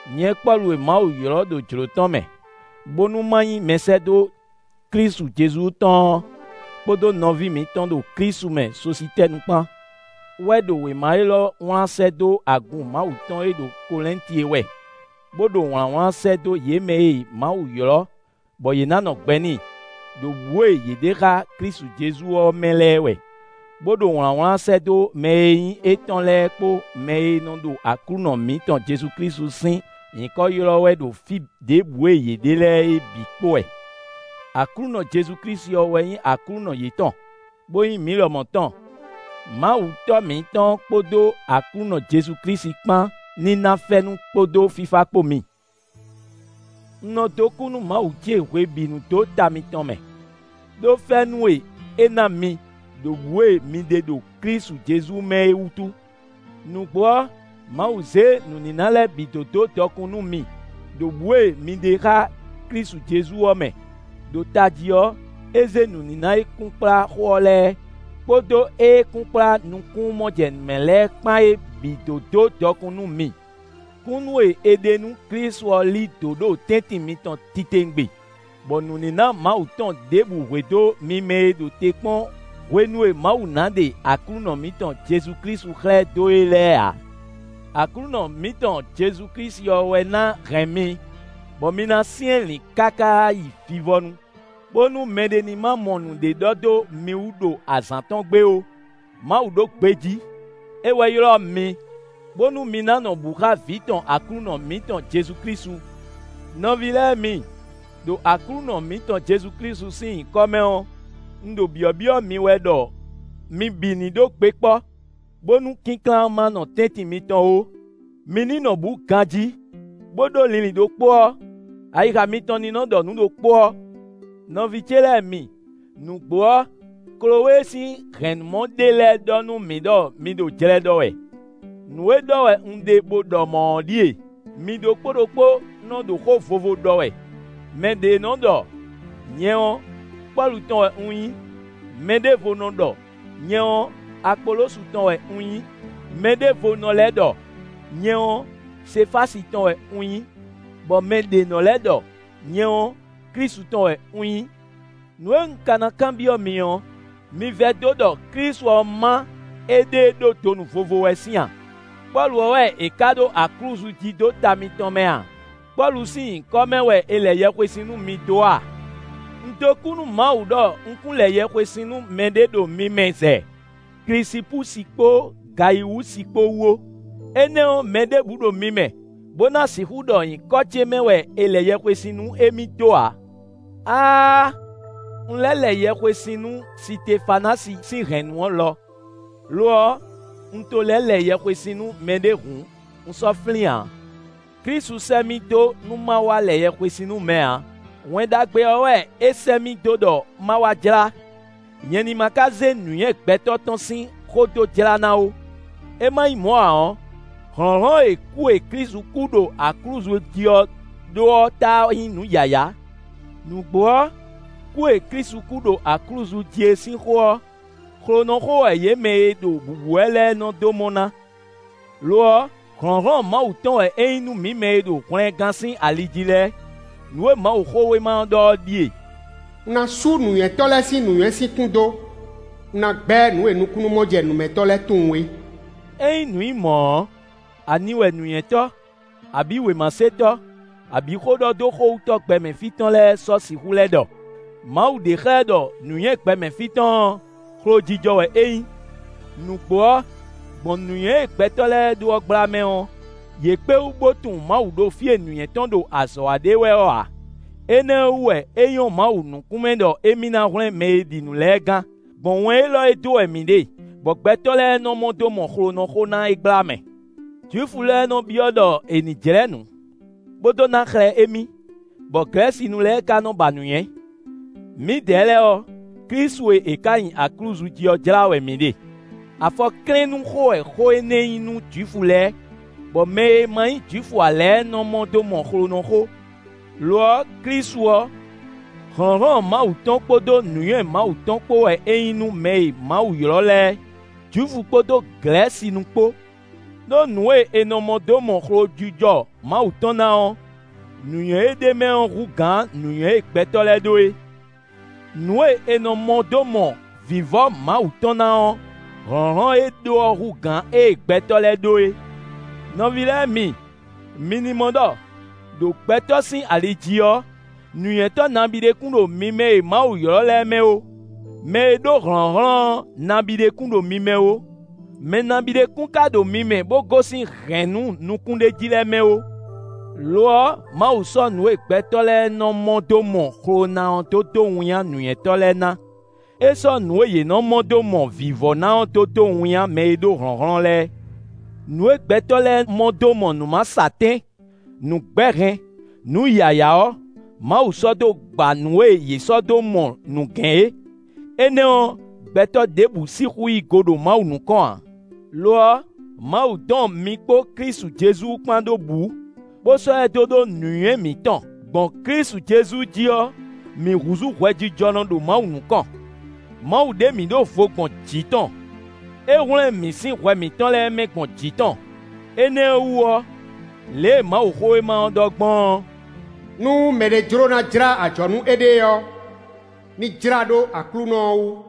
Nyɛ Pɔ́lu e Mawu ylɔ́ ɖo jlǒ tɔn mɛ, bónú ma nyí mɛsɛ́dó Klísu Jezu tɔn ɔ́ kpódó nɔví mǐtɔn ɖo Klísu mɛ Sositɛ́nu kpán wɛ ɖo wěma élɔ́ wlán sɛ́ dó agun Mawu tɔn e ɖo Kɔlɛ́nti é wɛ, bó ɖo wlǎnwlán sɛ́ dó yě mɛ e Mawu ylɔ́, bɔ yě ná nɔ gbɛ n'i, ɖo bǔ e yě ɖe xá Klísu Jezu ɔ́ mɛ lɛ́ɛ wɛ, bó ɖo wlǎnwlán sɛ́ dó mɛ e nyí étɔn lɛ́ɛ kpó mɛ e nɔ ɖo Aklúnɔ mǐtɔn Jezu Klísu sín nyǐkɔ ylɔ́ wɛ ɖo fí ɖěbǔ e yě ɖe lɛ́ɛ é bǐ kpó wɛ. Aklúnɔ Jezu Klísu ɔ́ wɛ nyí Aklúnɔ yětɔn, bó nyí mǐ lɔmɔ̌ tɔn. Mawu Tɔ́ mǐtɔn ɔ́ kpódó Aklúnɔ Jezu Klísu kpán ní ná fɛ́nú kpódó fífá kpó mi. Un nɔ dó kú nú Mawu ce hwebǐnu dó ta mitɔn mɛ, ɖó fɛ́nú e é ná mi ɖo bǔ e mi ɖe ɖo Klísu Jezu mɛ é wútu. Nǔgbó ɔ́, Mawu zě nǔníná lɛ́ɛ bǐ dó dó dɔkun nú mi, ɖo bǔ e mi ɖe xá Klísu Jezu ɔ́ mɛ; ɖo tají ɔ́, é zé nǔníná e kunkplá xó ɔ́ lɛ́ɛ, kpódó éé kunkplá nukúnnú-mɔjɛnǔmɛ lɛ́ɛ kpán é bǐ dó dó dɔkun nú mi. Kúnnu e è ɖe nú Klísu ɔ́ lí dǒ ɖo tɛ́ntin mitɔn titewungbe, bɔ nǔníná Mawu tɔn ɖěbǔ hwedó mi mɛ e ɖo te kpɔ́n hwenu e Mawu ná ɖe Aklúnɔ mǐtɔn Jezu Klísu xlɛ́ dó é lɛ́ɛ ǎ. Aklúnɔ mǐtɔn Jezu Klísu ɔ́ wɛ ná hɛn mi, bɔ mi na syɛ́nlǐn káká yi vivɔnu, bónú mɛɖé ní ma mɔ nǔɖé ɖɔ dó mi wú ɖo azǎn tɔn gbe ó. Mawu ɖo gbejí. É wɛ ylɔ́ mi, bónú mi ná nɔ bǔ xá Vǐ tɔn Aklúnɔ mǐtɔn Jezu Klísu. Nɔví lɛ́ɛ mi, ɖo Aklúnɔ mǐtɔn Jezu Klísu sín nyǐkɔ mɛ ɔ́, un ɖo byɔ̌byɔ́ mi wɛ ɖɔ mi bǐ ní ɖó gbe kpɔ́, bónú kínklán ma nɔ tɛ́ntin mitɔn ó; mi ní nɔ bǔ ganjí, bó ɖó linlin ɖokpó ɔ́; ayixa mitɔn ní nɔ ɖɔ nǔ ɖokpó ɔ́. Nɔví ce lɛ́ɛ mi, nǔgbó ɔ́, Klowée sín hɛ̌nnumɔ ɖé lɛ́ɛ ɖɔ nú mǐ ɖɔ mi ɖo jlɛ ɖɔ wɛ. Nǔ e ɖɔ wɛ un ɖe bó ɖɔ mɔ̌ ɔ́ ɖíe: mi ɖokpó ɖokpó nɔ́ ɖo xó vovo ɖɔ wɛ; mɛ ɖě nɔ ɖɔ: “Nyɛ ɔ́, Pɔ́lu tɔn wɛ un nyí”; mɛɖěvo nɔ ɖɔ: “Nyɛ ɔ́, Apolosu tɔn wɛ un nyí”; mɛɖěvo nɔ lɛ́ ɖɔ: “Nyɛ ɔ́, Sefási tɔn wɛ un nyí”; bɔ mɛ ɖě nɔ lɛ́ ɖɔ: “Nyɛ ɔ́, Klísu tɔn wɛ un nyí.” Nǔ e un ka ná kanbyɔ́ mi ɔ́, mi vɛdó ɖɔ Klísu ɔ́ má éɖée ɖó donu vovo wɛ sín a? Pɔ́lu ɔ́ wɛ è ká ɖó aklúzu jí dó ta mitɔn mɛ a? Pɔ́lu sín nyǐkɔ mɛ wɛ è lɛ yɛhwesin nú mi dó a? Un dó kú nú Mawu ɖɔ un kún lɛ yɛhwesin nú mɛɖé ɖo mi mɛ zɛ Klisipúsi kpó Gayiwúsi kpó wú ó. Énɛ́ ɔ́, mɛ ɖěbǔ ɖo mi mɛ bó ná sixú ɖɔ nyǐkɔ ce mɛ wɛ è lɛ yɛhwesin nú émí dó ǎ. (Áááá! Un lɛ́ lɛ yɛhwesin nú Sitefanási sín hɛ̌nnu ɔ́ lɔ; lo ɔ́, un to lɛ́ lɛ yɛhwesin nú mɛɖé hǔn, un sɔ́ flín ǎ.) Klísu sɛ́ mì dó nú má wá lɛ yɛhwesin nú mɛ ǎ; Wɛn Ɖagbe ɔ́ wɛ é sɛ́ mì dó ɖɔ má wá jlá; nyɛ ní má ka zé nǔnywɛ́ gbɛtɔ́ tɔn sín xó dó jlá ná ó; é má nyí mɔ̌ ǎ ɔ́, hlɔ̌nhlɔ́n e kú e Klísu kú ɖo aklúzu jí ɔ́ ɖó ɔ́ táá nyí nǔ yǎyá. Nǔgbó ɔ́, kú e Klísu kú ɖo aklúzu jí é sín xó ɔ́, xlonɔxó wɛ yě mɛ e ɖo bǔbú wɛ lɛ́ɛ nɔ dó mɔ ná; lo ɔ́, hlɔ̌nhlɔ́n Mawu tɔn wɛ é nyí nú mǐ mɛ e ɖo hwlɛngán sín ali jí lɛ́ɛ. Nǔ e Mawuxówéma ɔ́ ɖɔ ɔ́ ɖíe: “Un ná sú nǔnywɛ́tɔ́ lɛ́ɛ sín nǔnywɛ́ sín kún dó; un ná gbɛ́ nǔ e nukúnnú-mɔjɛnǔmɛtɔ́ lɛ́ɛ tunwun é.” Ényí nǔ nyí mɔ̌ ɔ́, ani wɛ nǔnywɛ́tɔ́, abǐ wěmasetɔ́, abǐ xóɖɔdóxówútɔ́ gbɛmɛ fí tɔn lɛ́ɛ sɔ́ sixú lɛ́ ɖɔ? Mawu ɖe xlɛ́ ɖɔ nǔnywɛ́ gbɛmɛ fí tɔn ɔ́, xlojijɔ wɛ é nyí. Nǔgbó ɔ́, gbɔn nǔnywɛ́ e gbɛtɔ́ lɛ́ɛ ɖó ɔ́ gbla mɛ ɔ́, yě kpé wú bó tunwun Mawu ɖo fí e nǔnywɛ́ tɔn ɖo azɔ̌ wa ɖe wɛ ɔ́ ǎ. Énɛ́ ɔ́ wú wɛ é nyɔ́ Mawu nukún mɛ ɖɔ émí ná hwlɛ́n mɛ e ɖi nǔ lɛ́ɛ gán, gbɔn wɛn élɔ́ e dó wɛ mǐ ɖe, bɔ gbɛtɔ́ lɛ́ɛ nɔ mɔ dó mɔ xlonɔxó ná é gbla mɛ. Jwifu lɛ́ɛ nɔ byɔ́ ɖɔ è nǐ jlɛ́ nǔ, bó dó ná xlɛ́ émí, bɔ Glɛ̌sinu lɛ́ɛ ka nɔ ba nǔnywɛ́. Mǐdɛɛ lɛ́ɛ ɔ́, Klísu e è ká nyi aklúzu jí ɔ́ jlá wɛ mǐ ɖe: afɔklɛ́nnúxó wɛ xó énɛ́ nyí nú Jwifu lɛ́ɛ, bɔ mɛ e ma nyí Jwifu ǎ lɛ́ɛ nɔ́ mɔ dó mɔ xlonɔxó. Lo ɔ́, Klísu ɔ́, hlɔ̌nhlɔ́n Mawu tɔn kpódó nǔnywɛ́ Mawu tɔn kpó wɛ é nyí nú mɛ e Mawu ylɔ́ lɛ́ɛ; Jwifu kpódó Glɛ̌sinu kpó. Đó nǔ e è nɔ mɔ dó mɔ xlojijɔ Mawu tɔn ná ɔ́, nǔnywɛ́ e ɖ'é mɛ ɔ́ hú gǎn nǔnywɛ́ e gbɛtɔ́ lɛ́ɛ ɖó é; nǔ e è nɔ mɔ dó mɔ vǐvɔ́ Mawu tɔn ná ɔ́, hlɔ̌nhlɔ́n e é ɖó ɔ́ hú gǎn ée gbɛtɔ́ lɛ́ɛ ɖó é. Nɔví lɛ́ɛ mi, mi ní mɔ ɖɔ, ɖo gbɛtɔ́ sín ali jí ɔ́, nǔnywɛ́tɔ́ nabíɖé kún ɖo mi mɛ e Mawu ylɔ́ lɛ́ɛ mɛ ó; mɛ e ɖó hlɔ̌nhlɔ́n ɔ́ nabíɖé kún ɖo mi mɛ ó; mɛ nabíɖé kún ka ɖo mi mɛ bó gosín hɛ̌nnu nukúnɖéjí lɛ́ɛ mɛ ó. Lo ɔ́, Mawu sɔ́ nǔ e gbɛtɔ́ lɛ́ɛ nɔ mɔ dó mɔ xlo ná ɔ́ dó dó winnyá nǔnywɛ́tɔ́ lɛ́ɛ ná; é sɔ́ nǔ e yě nɔ mɔ dó mɔ vǐvɔ́ ná ɔ́ dó dó winnyá mɛ e ɖó hlɔ̌nhlɔ́n lɛ́ɛ. Nǔ e gbɛtɔ́ lɛ́ɛ mɔ dó mɔ nǔ masɔatɛ́n, nǔ gbɛ́hɛn, nǔ yǎyá ɔ́, Mawu sɔ́ dó gba nǔ e yě sɔ́ dó mɔ nǔgɛ́n é. Énɛ́ ɔ́, gbɛtɔ́ ɖěbǔ sixú yí go ɖo Mawu nukɔn ǎ. Lo ɔ́, Mawu dɔn mi kpó Klísu Jezu kpán ɖó bǔ, bó sɔ́ ɛ dó ɖó nǔnywɛ́ mǐtɔn. Gbɔn Klísu Jezu jí ɔ́, mǐ húzú hwɛjijɔnɔ ɖo Mawu nukɔn; Mawu ɖe mǐ ɖó vo gbɔn jǐ tɔn; é hwlɛ́n mǐ sín hwɛ mǐtɔn lɛ́ɛ mɛ gbɔn jǐ tɔn. Énɛ́ ɔ́ wú ɔ́, lě e Mawuxówéma ɔ́ ɖɔ gbɔn ɔ́: “Nú mɛɖé jló ná jlá ajɔ̌ nú éɖée ɔ́, ní jlá ɖó Aklúnɔ ɔ́ wú.”